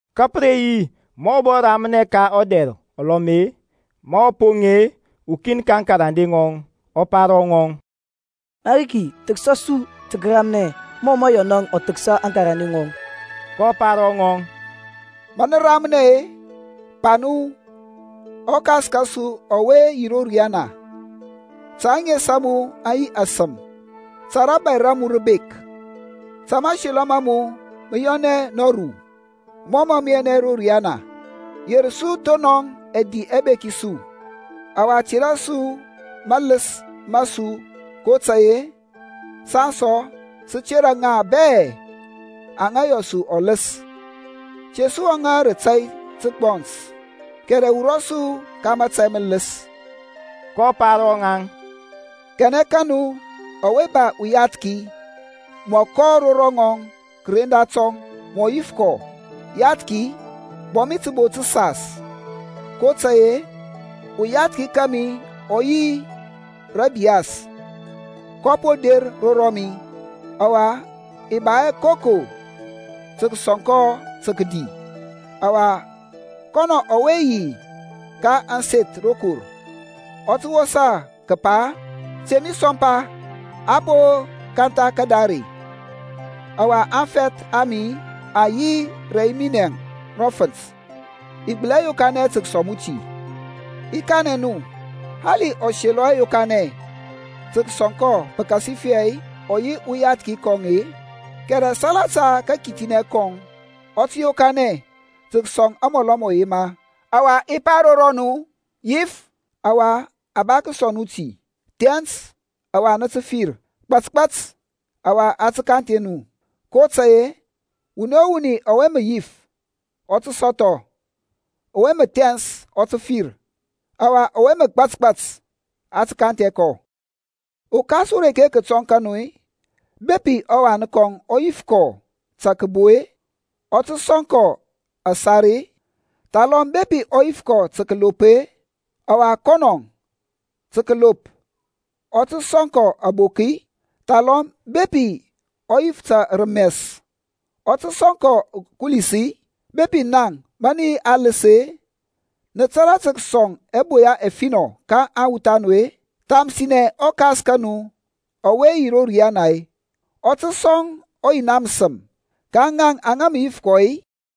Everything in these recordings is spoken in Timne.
Ka pə re yi ma ɔ bɔ ramnɛ ka ɔdɛr ulɔm, ma ɔ poŋ-e, ukin ka aŋkarande ŋɔŋ ɔ pa ro ŋɔŋ, Mariki thəksa su tə kəramnɛ mɔ mə Yɔnȧŋ ɔ thəksa aŋkarande ŋɔŋ. kɔ pa ro ŋaŋ, Ma nə ramnɛ-e, pa nu, ƆKas kȧsu ɔwe yi ro riyana, ta ȧŋes a mu aŋ yi asəm. Ta rȧbȧy ra mu rə bek. Ta mȧselɔ ma mu mə yɔnɛ nɔru mɔ mȧ mə yɔnɛ ro riyana. Yer su thonɔŋ ɛdi ɛbeki su, ɔwa tera su maləs ma su kotȧy-e saŋ sɔ sə tera ŋaŋ bɛ aŋa yɔ su ɔləs. Te su wɔŋȧ rə tȧy ta məgbɔns, kɛrɛ wurɔ su ka mȧtȧy mələs. kɔ pa ro ŋaŋ, Kanɛ ka nu ɔwe ba uyathki, mɔ kɔ ro rɔŋɔŋ kəren datɔŋ, mɔ yif kɔ, Yathki, bɔ mi təbo təsas, kotȧy-e, uyathki kȧmi ɔ yi rə ȧbiyas, kɔ po der ro rɔmi, ɔwa i ba hɛ koko tə kəsɔŋ kɔ tə kədi. Ɔwa kɔnɔ ɔwe yi ka ȧŋseth rokor ɔ tə wosa kəpa, Te mi sɔmpa. A po kantha kadare, ɔwa aŋfɛth a mi aŋ yi rɛ yi minɛŋ ro fənt. I gbəli hɛ yokanɛ tə kəsɔŋ mu ti. I kanɛ nu, Hali ɔ selɔ hɛ yokanɛ tə kəsɔŋ kɔ pəkasifɛ ɔ yi ɔyathki kɔŋ-e, kɛrɛ salata kakithinɛ kɔŋ, ɔ tə yokanɛ tə kəsɔŋ amɔlɔ mɔ yema. Ɔwa i pa ro rɔnu, Yif, ɔwa a ba tə kəsɔŋ nu ti; thɛns, ɔwa nə tə fir; gbȧtgbȧt, ɔwa a tə kanthɛ nu. kotȧy-e wuni o wuni ɔwe mə yif, ɔ tə sɔthɔ; ɔwe mə thɛns ɔ tə fir; ɔwa ɔwe mə gbȧtgbȧt, a tə kanthɛ kɔ. Ukas ureke kətɔŋ ka nu-i, bepi ɔwan kɔŋ ɔ yif kɔ ta kəbo-e, ɔ tə sɔŋ kɔ asar-e? Thalɔm bepi ɔ yif ta kəlop-e, ɔwa kɔnɔ-e, ta kəlop, ɔ tə sɔŋ kɔ ȧbok-i? Thalɔm bepi ɔ yif ta rəmɛs-e, ɔ tə sɔŋ kɔ ukulis-i? Bepi naŋ, ma nə yi aləs-e, nə tȧrȧ tə kəsɔŋ ɛboya ɛfinɔ ka aŋwuth a nu-e, thamsinɛ ɔKas ka nu ɔwe yi ro riana-e, ɔ tə sɔŋ ɔYina məsəm ka ŋaŋ aŋa mə yif kɔ-i?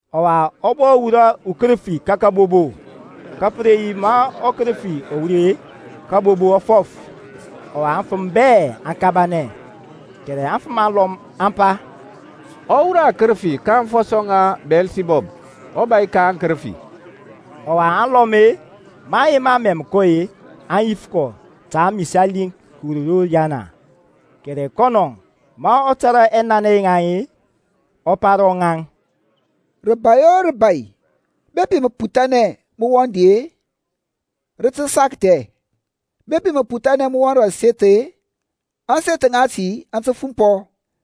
Ɔwa, ɔ bɔ wurɔ ukərəfi ka kəbobo. Ka pə re yi ma ɔkərəfi ɔ wur-e, kabobo ɔ fɔf, ɔwa aŋfəm bɛ aŋ kabanɛ. Kɛrɛ afəm alɔm aŋ pa, Ɔ wurɔ akərəfi ka aŋfɔsɔ ŋa Biyɛlsibɔb, ɔbȧy ka aŋkərəfi. Ɔwa alɔm-e, maŋ yema mɛm kɔ-e, aŋ yif kɔ ta amisali kəwur ro riyana. Kɛrɛ kɔnɔ, ma ɔ tȧrȧ ɛnanɛ yaŋ-e, ɔ pa ro ŋaŋ, Rəbȧy o rəbȧy bepi məputhanɛ mə wɔŋ di-e, rə tə sakthɛ; bepi məputhanɛ mə wɔŋ rə aseth-e, ȧŋseth ŋati aŋ tə fumpɔ.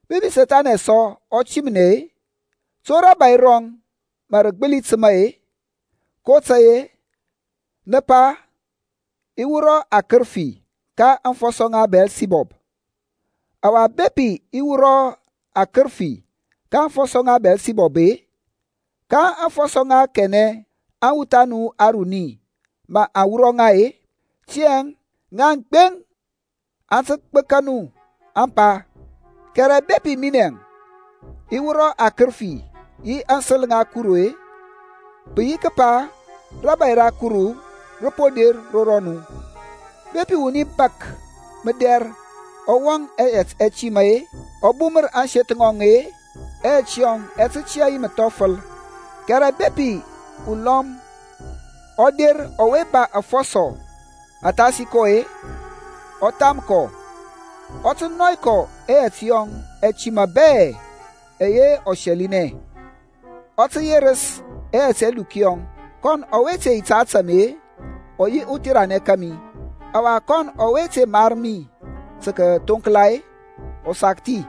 Bepi Sethani sɔ ɔ timnɛ-e, to rȧbȧy rɔŋ mə rə gbəli təma-e? kotȧy-e nə pa i wurɔ akərəfi ka aŋfɔsɔ ŋa Biyɛlsibɔb. Ɔwa bepi i wurɔ akərəfi ka aŋfɔsɔ ŋa Biyɛlsibɔb-e, ka aŋfɔsɔ ŋa kanɛ aŋwuth a nu aruni mə aŋ wurɔ ŋa-e? Tiyȧŋ ŋaŋ gbeŋ aŋ tə gbəka nu ȧŋpa. Kɛrɛ bepi minɛ i wurɔ akərəfi yi aŋsəl ŋa Kuru-e, pə yi kəpa rȧbȧy ra Kuru rə po der ro rɔnu. Bepi wuni bȧk mədɛr ɔ wɔŋ ɛyɛt ɛtima-e, ɔ bumər ȧŋseth ŋɔŋ-e, ɛyɛt yɔŋ ɛ tə tiyȧ yi məthɔfəl; kɛrɛ bepi ulɔm ɔ der ɔwe ba afɔsɔ athasi kɔ-e, ɔ tham kɔ, ɔ tə nɔy kɔ ɛyɛt yɔŋ ɛtima bɛ ɛyɛ ɔ sɛlinɛ, ɔ tə yerəs ɛyɛt ɛluk yɔŋ. Kɔn ɔwe te yi ta ȧtȧ mi ɔ yi utheranɛ kȧmi; ɔwa kɔnɔ ɔwe te mar mi tə kəthonkla-e, ɔ sakthi.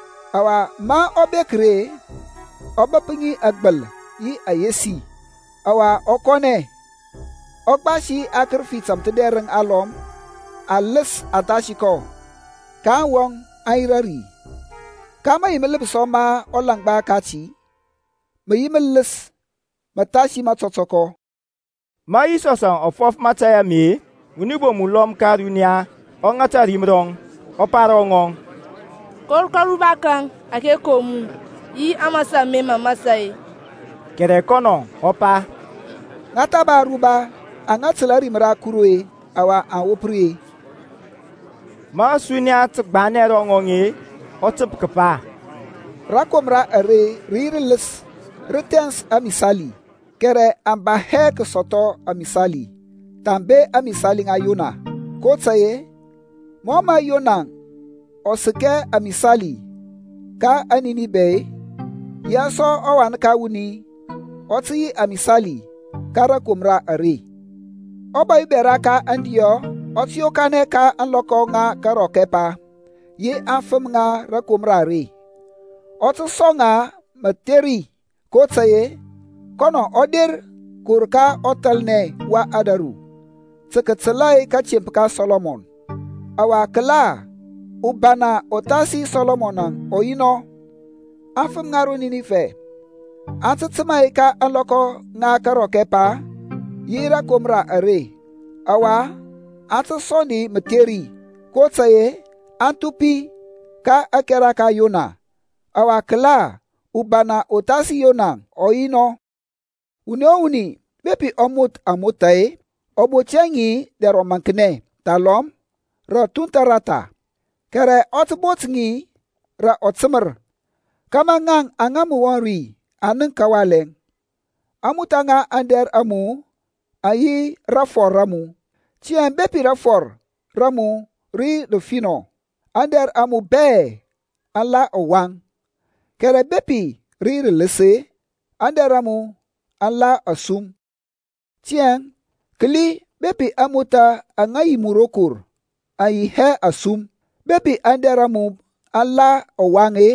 Ɔwa ma ɔ bek-e, ɔ bəp ŋi agbal yi ayesi. Ɔwa ɔ kɔnɛ, ɔ gbasi akərəfi tȧmthədɛrəŋ alɔm aləs athasi kɔ, kaŋ wɔŋ aŋ yirȧ ri; ka mayi mələpsɔ ma ɔlaŋgba kati mə yi mələs məthasi matɔtɔkɔ. Ma Yisɔsȧŋ ɔ fɔf mȧtȧy ame-e, wuni bom ulɔm ka ȧruniya ɔ ŋata ȧrim rɔŋ, ɔ pa ro ŋɔŋ, Kor ka aruba kaŋ ȧke kom mu, yi aŋmȧsȧ ȧme mə mȧsȧ-e. Kɛrɛ kɔnɔ ɔ pa, Ŋa tha ba aruba aŋa təl ȧrim ra Kuru-e ɔwa aŋ wop ri. Ma ȧsuniya tə gbanɛ ro ŋɔŋ-e, ɔ təp kəpa, Rakomra are rə yi rələs, rə thɛns amisali, kɛrɛ aŋ ba hɛ tə kəsɔthɔ amisali thambe ȧŋmisali ŋa Yona. kotȧy-e mɔ mə Yona ɔ səkɛ amisali ka aŋNinifɛ-e, yaŋ sɔ ɔWan ka wuni ɔ tə yi amisali ka rȧkomra are. Ɔbȧy ubɛra ka aŋdiɔ ɔ tə yokanɛ ka ȧŋlɔkɔ ŋa karɔk ɛpa yi aŋfəm ŋa rȧkomra are, ɔ tə sɔŋ ŋa mətheri, kotȧy-e kɔnɔ ɔ der kəwur ka ɔthalnɛ wa ȧdȧru tə kətəl kȧtemp ka Sɔlɔmɔn; ɔwa kəla, ubana uthasi Sɔlɔmɔn ɔ yi anɔ. Aŋfəm ŋa ro Ninibɛ aŋ tə təmȧ ka ȧŋlɔkɔ ŋa karɔk ɛpa yi rȧkomra are ɔwa aŋ tə sɔŋ di mətheri, kotȧy-e aŋ thupi ka ȧkɛra ka Yona; ɔwa kəla, ubana uthasi Yona ɔ yi anɔ. Wuni o wuni bepi ɔ moth amotha-e, ɔ bot hɛ ŋi dɛr ɔmaŋknɛ thalɔm rə ȧthunthȧ rata, kɛrɛ ɔ tə bot ŋi rȧ ɔtəmər, kȧmȧ ŋaŋ aŋa mə wɔŋ ri aŋ nənk kawalɛ. ȧŋmothȧ ŋa aŋdɛr a mu aŋ yi rafɔr ra mu. Tiyȧŋ bepi rafɔr ra mu rə yi rəfinɔ, aŋdɛr a mu bɛ aŋ la ɔwaŋ; kɛrɛ bepi rə yi rələs-e, aŋdɛr a mu aŋ la asum. Tiyȧŋ kəli bepi ȧŋmothȧ aŋa yi mu rokor aŋyi hɛ asum. Bepi aŋdɛr a mu aŋla ɔwaŋ-e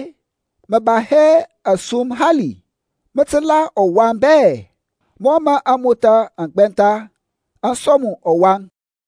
mə ba hɛ asum hali, mə tə la ɔwaŋ bɛ, mɔ mə amotha aŋ gbɛntha aŋ sɔŋ mu ɔwaŋ.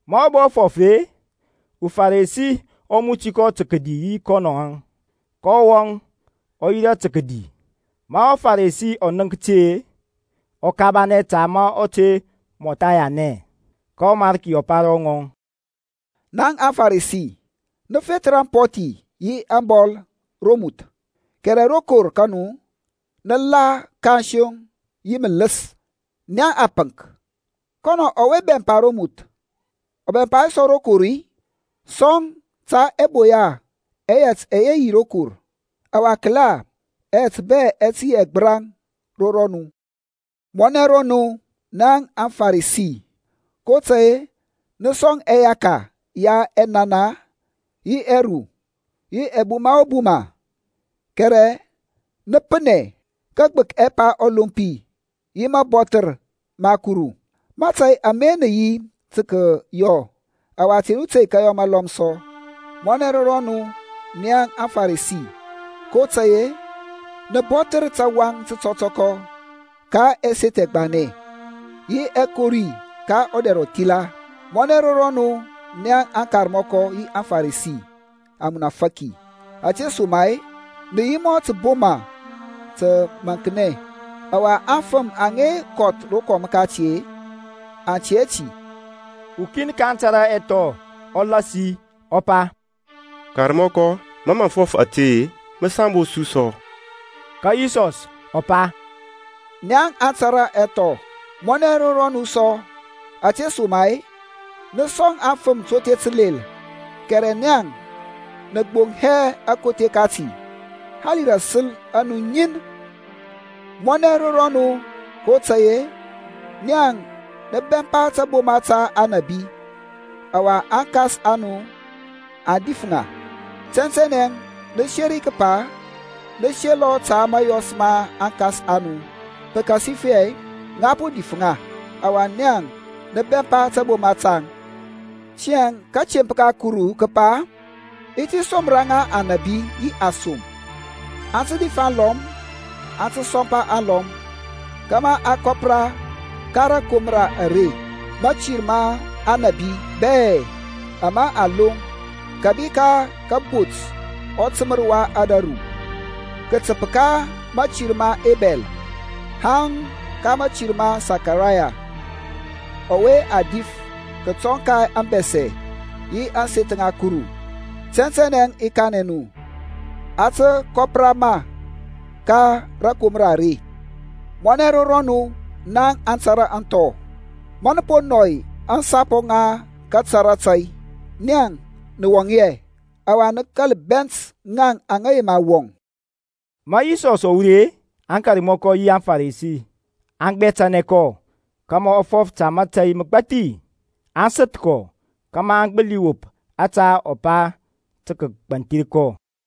Ma ɔ bɔ fɔf-e, uFarisi ɔ muti kɔ tə kədi yi kɔnɔŋȧŋ, kɔ wɔŋ, ɔ yirȧ tə kədi. Ma ɔFaresi ɔ nənk ti, ɔ kabanɛ ta ma ɔ te mɔtha yanɛ. Ka ɔMarki ɔ pa ro ŋɔŋ, Naŋ naŋ aFaresi nə fethər ampɔthi yi ȧŋbɔl romuth, kɛrɛ rokor ka nu nə la kansoŋ yi mələs. Naŋ apənk, kɔnɔ ɔwe bɛmpa romuth ɔ bɛmpa hɛ sɔ rokor-i? Sɔŋ ta ɛboya ɛyɛt ɛyɛ yi rokor, ɔwa kəla, yɛt bɛ ɛ tə yi ɛgbəraŋ ro rɔnu. Mɔnɛ ro nu, nia aFaresi! kotȧy-e nə sɔŋ ɛyaka ya ɛnana yi ɛru yi ɛbuma o buma, kɛrɛ nə painɛ kagbək ɛpa ɔlompi yi mabɔthər ma Kuru. Mȧtȧy ame nə yi tə kəyɔ, ɔwa te nu tey tə kəyɔ malɔm sɔ. Mɔnɛ ro rɔnu, naŋ aFaresi! kotȧy-e, nə bɔthər tawaŋ tətɔtɔkɔ ka ɛseth ɛgbanɛ yi ɛkori ka ɔdɛr ɔthila. Mɔnɛ ro rɔnu naŋ akarmɔkɔ yi aFaresi, amunafaki! Ȧtesoma-e nə yi mɔ taboma təmaŋknɛ, ɔwa aŋfəm aŋa kɔth rokɔm kati aŋ tɛ hɛ ti. Ukin ka aŋtara ɛthɔ ɔ lasi ɔ pa, Karmɔkɔ, ma mə fɔf ȧte-e, mə sambos su sɔ. Ka Yisɔs ɔ pa, Naŋ aŋtȧrȧ aŋthɔ, mɔnɛ ro rɔnu sɔ! Ȧtesoma-e nə sɔŋ aŋfəm tothe təlel, kɛrɛ naŋ nə gboŋ hɛ atothe tati, hali rə ȧsəl a nu ŋin. Mɔnɛ ro rɔnu! kotȧy-e naŋ nə bɛmpa taboma ta aŋnabi, ɔwa aŋkas a nu aŋ dif ŋa. Tɛntɛnɛ nə seri kəpa nə selɔ ta mȧyɔs ma aŋkas a nu; pəkasifɛ ŋa po dif ŋa, ɔwa naŋ nə bɛmpa taboma taŋ. Tiyȧŋ kȧtemp ka Kuru kə pa, I ti somra ŋa anȧbi yi asom; aŋ tə dif alɔm, aŋ tə sɔmpa alɔm, kȧmȧ a kɔpra ka rȧkomra are mȧtir ma aŋnabi bɛ ama a loŋ kȧbi ka kabot ɔtəmər wa ȧdȧru, kətəp ka mȧtir ma Ebɛl haŋ ka mȧtir ma Sakaraya ɔwe a dif kətɔŋ ka ȧŋbɛsɛ yi ȧŋseth ŋa Kuru. Tɛntɛnɛ i kanɛ nu, a tə kɔpra ma ka rȧkomra are. Mɔnɛ ro rɔnu na aŋtȧrȧ aŋthɔ, ma nə po nɔy aŋsapɔ ŋa kətara tȧy! Nan nə wɔŋ hɛ, ɔwa nə bɛnt ŋaŋ aŋa yema wɔŋ. Ma Yisɔs ɔ wur-e, aŋkarmɔkɔ yi aŋFarisi aŋ gbɛtənɛ kɔ kȧmȧ ɔ fɔf ta mȧtȧy məgbathi; aŋ səth kɔ kȧmȧ aŋ gbəli wop ȧtȧ ɔ pa tə kəgbanthir kɔ.